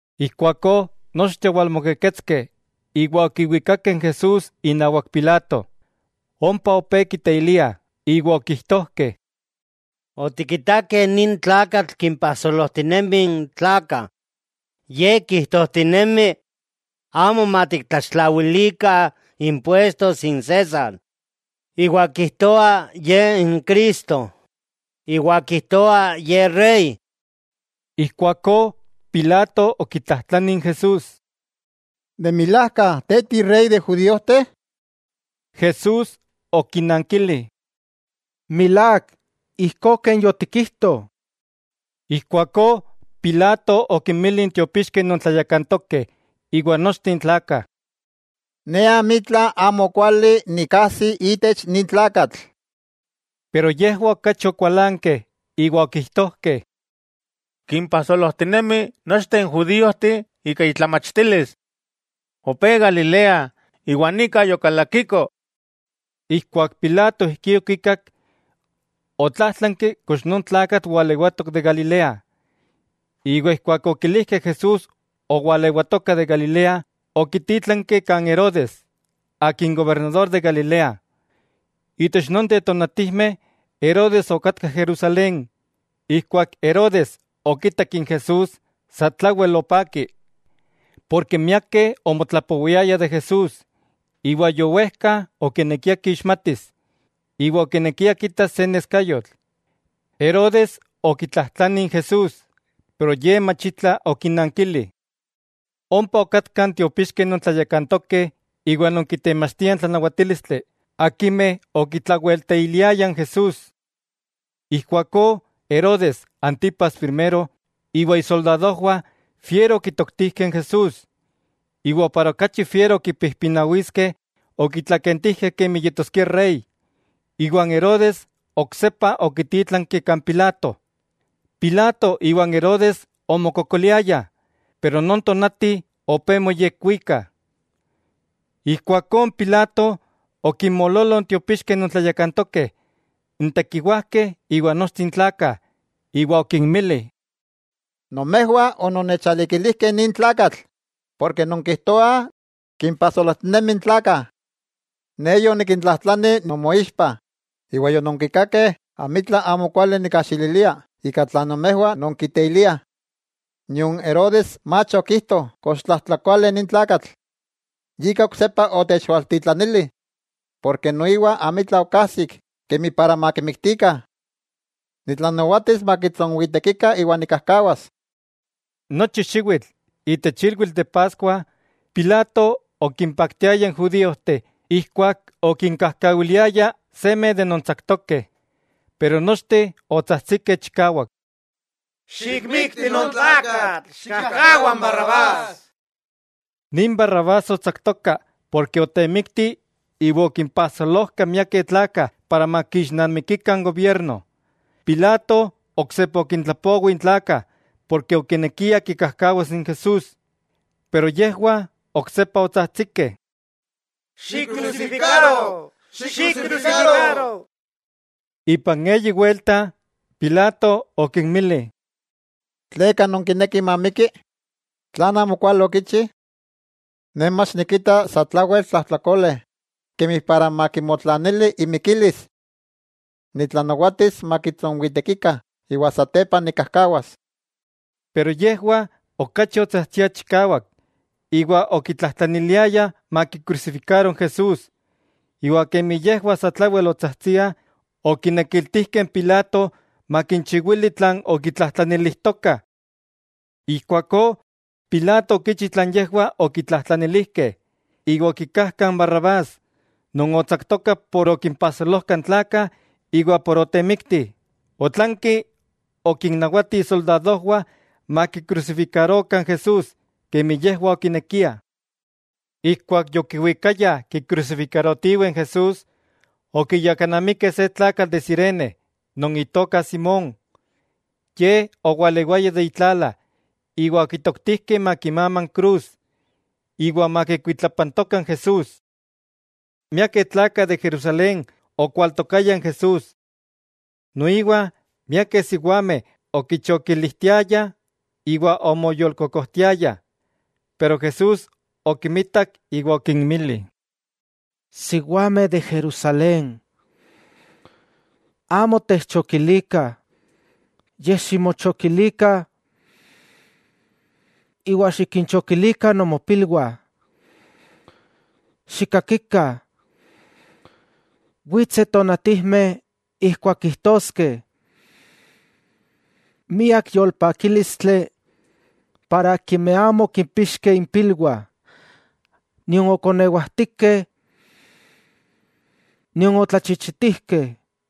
Ijkuakó nochteh owalmokeketskeh, iwa okiwikakeh n Jesús inawak Pilato. Ompa opé kiteiliah, iwa okijtojkeh: —Otikitakeh nin tlakatl kimpajsolojtinemi n tlakah. Ye kijtojtinemi amo matiktlaxtlawilikah impuestos n César, iwa kijtoa ye n Cristo, iwa kijtoa Ye rey. Ijkuakó Pilato okitlajtlani n Jesús: —¿De milajka te inrey n judíojteh? Jesús okinankili: —Milák, ijkó ken yotikijto. Ijkuakó Pilato okinmili n tiopixkeh non tlayakantokeh iwa nochteh n tlakah: —Ne amitla amokuali nikajsi itech nin tlakatl. Pero yejwah okachi okualankeh iwa okijtojkeh: —Kimpajsolojtinemi nochteh n judiojteh ika itlamachtilis. Opé Galilea, iwa nika yokalakiko. Ijkuak Pilato ijkí okikak, otlájtlanki kox non tlakatl walewatok de Galilea. Ijkuak okilijkeh Jesús owalewatoka de Galilea, okitítlanki kan Herodes, gobernador de Galilea. Itech nonteh tonatijmeh Herodes okatka Jerusalén. Ijkuak Herodes okitak n Jesús satlawel opaki; porke miakeh omotlapowiayah de Jesús iwa yowejka okinekia kixmatis, iwa okinekia kitas se neskayotl. Herodes okitlatlajtlani n Jesús, pero Ye machitla okinankili. Ompa okatkah n tiopixkeh non tlayakantokeh iwa non kitemachtiah n tlanawatílistli, akimeh okitlawelteiliayah n Jesús. Ijkuakó Herodes Antipas Primero iwa isoldadojwah fiero okitoktijkeh n Jesús, iwa para okachi fiero kipijpinawiskeh okitlakentijkeh kemi yetoskia Rey, iwa n Herodes oksepa okitítlanki kan Pilato. Pilato iwa n Herodes omokokoliayah, pero non tonati opé moyekwikah. Ijkuakó n Pilato okinmoololoh n tiopixkeh non tlayakantokeh, n tekiwajkeh iwa nochteh n tlakah, iwa okinmili: —Nomejwah ononnechalikilijkeh nin tlakatl, porke nonkijtoah kimpajsolojtinemi n tlakah. Ne yoniktlatlajtlani nomoixpah, iwa yononkikakeh amitla amokuali nikkajxililia ika tlan nomejwah nonkiteiliah. Nion Herodes mach okijto kox tlajtlakole nin tlakatl, yika oksepa otechaltitlanili, porke noiwa amitla okajsik kemi para matikmiktikah. Nitlanawatis makitsonwitekikah iwa nikkajkawas. Nochi xiwitl itech ilwitl de Paskua, Pilato okimpaktiaya n judíojteh ijkuak okinkajkawiliaya seme de non tsaktokeh. Pero nochteh otsajtsikeh chikawak: —¡Xikmikti non tlakatl! ¡Xikkajkawa n Barrabás! Nin Barrabás otsaktoka porke otemikti iwa okimpajsolojka miakeh tlakah para makixnamikikah n gobierno. Pilato oksepa okintlapowi n tlakah porke okinekia kikajkawas n Jesús. Pero yejwah oksepa otsajtsikeh: —¡Xikkrusifikaro! ¡Xikkrusifikaro! Ipan eyi welta Pilato okinmili: —¿Tleka nonkinekih mamikki?, ¿tlan amo kuali okichi? Ne mach nikita satlawel tlajtlakole, kemi para makimotlanili imikilis. Nitlanawatis makitsonwitekikah iwa satepa nikkajkawas. Pero yejwah okachi otsajtsiah chikawak iwa okitlajtlaniliayah makikrusifikaro n Jesús; iwa kemi yejwah satlawel otsajtsiah, okinekiltijkeh n Pilato makinchiwili tlan okitlajtlanilijtokah. Ijkuakó Pilato okichi tlan yejwah okitlajtlanilijkeh, iwa okikajka n Barrabás, non otsaktoka por okimpajsolojka n tlakah iwa por otemikti, otlanki okinnawati isoldadojwah makikrusifikarokah n Jesús kemi yejwah okinekiah. Ijkuak yokiwikayah kikrusifikarotiweh n Jesús, okiyakanamikeh se tlakatl de Cirene non itoka Simón. Ye owalewaya de itlala iwa okitoktijkeh makimama n krus, iwa makikuitlapantoka n Jesús. Miakeh tlakah de Jerusalén okwaltokayah n Jesús. Noiwa miakeh siwameh okichokilijtiayah iwa omoyolkokojtiayah. Pero Jesús okimitak iwa okinmili: —Siwameh de Jerusalén, amo techchokilikah, yej ximochokilikah iwa xikinchokilikah nomopilwah. ¡Xikakikah!, witseh tonatijmeh ijkuak kijtoskeh: “Miak yolpakílistli para akimeh amo okimpixkeh impilwah, nion okonewajtikeh nion otlachichitijkeh.”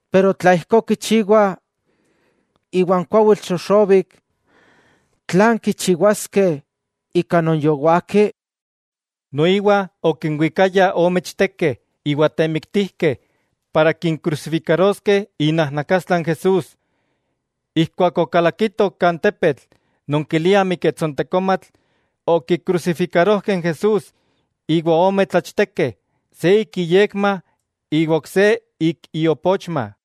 Pero tla ijkó kichiwah iwa n kuawitl xoxobik tlan kichiwaskeh ika non yowaki? Noiwa okinwikayah ome ichtekeh iwa temiktijkeh para kinkrusifikaroskeh inajnakastla n Jesús. Ijkuak okalakitoh kan tepetl non kiliah Miketsontekomatl, okikrusifikarojkeh n Jesús. Noiwa ompa okinkrusifikarojkeh ome tlachtekeh, se ik iyekma iwa n ok se ik iopochma.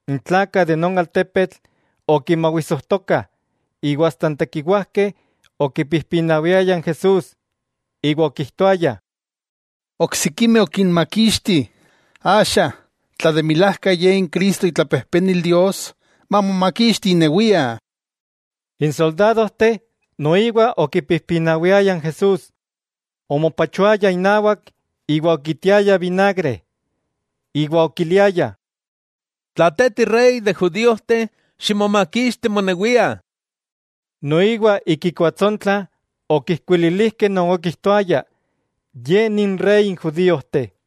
N tlakah de non altepetl okimawisojtokah, iwa asta n tekiwajkeh okipijpinawiayah n Jesús iwa okijtoayah: —Oksikimeh okinmakixti, axa, tla de milajka Ye n Cristo itlapejpenil Dios, mamomakixti inewia. N soldadojteh noiwa okipijpinawiayah n Jesús, omopachoayah inawak iwa okitiayah vinagre, iwa okiliayah: —Tla Te tirey de judíojtih, ximomakixti monewia. Noiwa ik ikuatsontla okijkuililijkeh non okijtoaya: “Ye ni inrey n judiojteh.”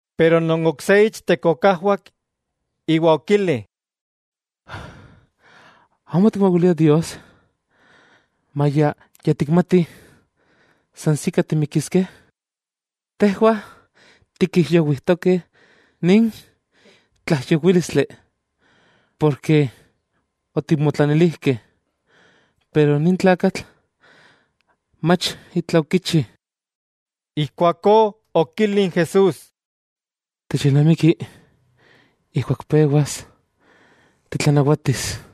Pero non ok se ichtek okajwak iwa okili: —¿Amo tikmawilia Dios, maya ya tikmati san sika timikiskeh? Tejwah tikijyowijtokeh nin tlaijyowílistli porke otikmotlanilijkeh, pero nin tlakatl mach itla okichi. Ijkuakó okili n Jesús: —Techilnamiki ijkuak pewas titlanawatis.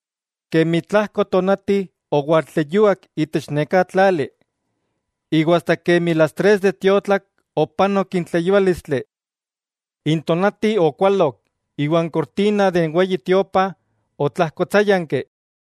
Kemi tlajko tonati owaltleyuak itech neká tlali, iwa asta kemi las tres de tiotlak opanok n tleyuálistli. N tonati okualok, iwa n kortina de n Weyi Tiopa, otlajkotsáyanki.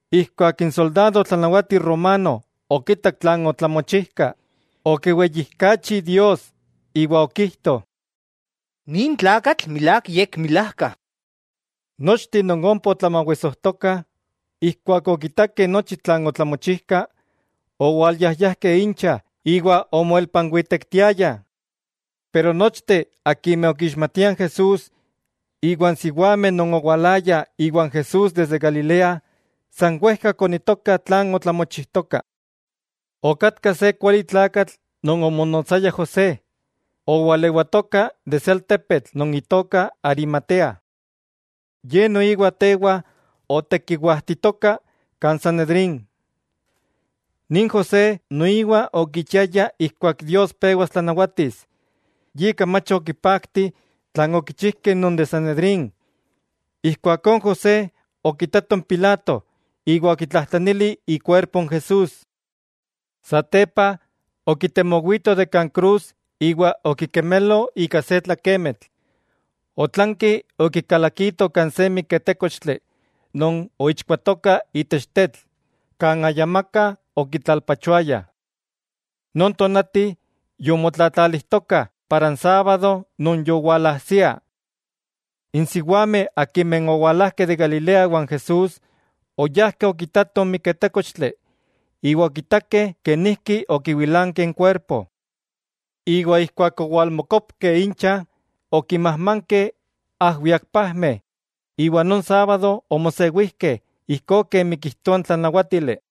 Ijkuak n soldado tlanawati romano okitak tlan otlamochijka, okiweyijkachi Dios iwa okijto: —Nin tlakatl milák yekmilajka. Nochteh non ompa otlamawisojtokah, ijkuak okitakeh nochi tlan otlamochijka owalyayajkeh incha iwa omoelpanwitektiayah. Pero nochteh akimeh okixmatiah n Jesús, iwa n siwameh non owalayah iwan Jesús desde Galilea, san wejka okoniitokah tlan otlamochijtoka. Okatka se kualitlakatl non omonotsaya José, owalewatoka de se altepetl non itoka Arimatea. Ye noiwa tewa otekiwajtitoka kan Sanedrín. Nin José noiwa okichiaya ijkuak Dios pewas tlanawatis, yika mach okipakti tlan okichijkeh non de Sanedrín. Ijkuakó n José okitato n Pilato iwa okitlajtlanili ikuerpo n Jesús. Satepa okitemowito de kan krus iwa okikemelo ika se tlakemitl, otlanki okikalakito kan se miketékochtli non oichkuatoka itech tetl kan ayamaka okitlalpachoayah. Non tonati yomotlatlalijtokah para n sábado non yowalajsia. N siwameh akimeh owalajkeh de Galilea iwan Jesús, oyajkeh okitatoh n miketékochtli, iwa okitakeh kenijki okiwilankeh n kuerpo. Iwa ijkuak owalmokopkeh incha, okinmajmankeh ajwiakpajmeh, iwa non sábado omosewijkeh ijkó kemi kijtoa n tlanawátili.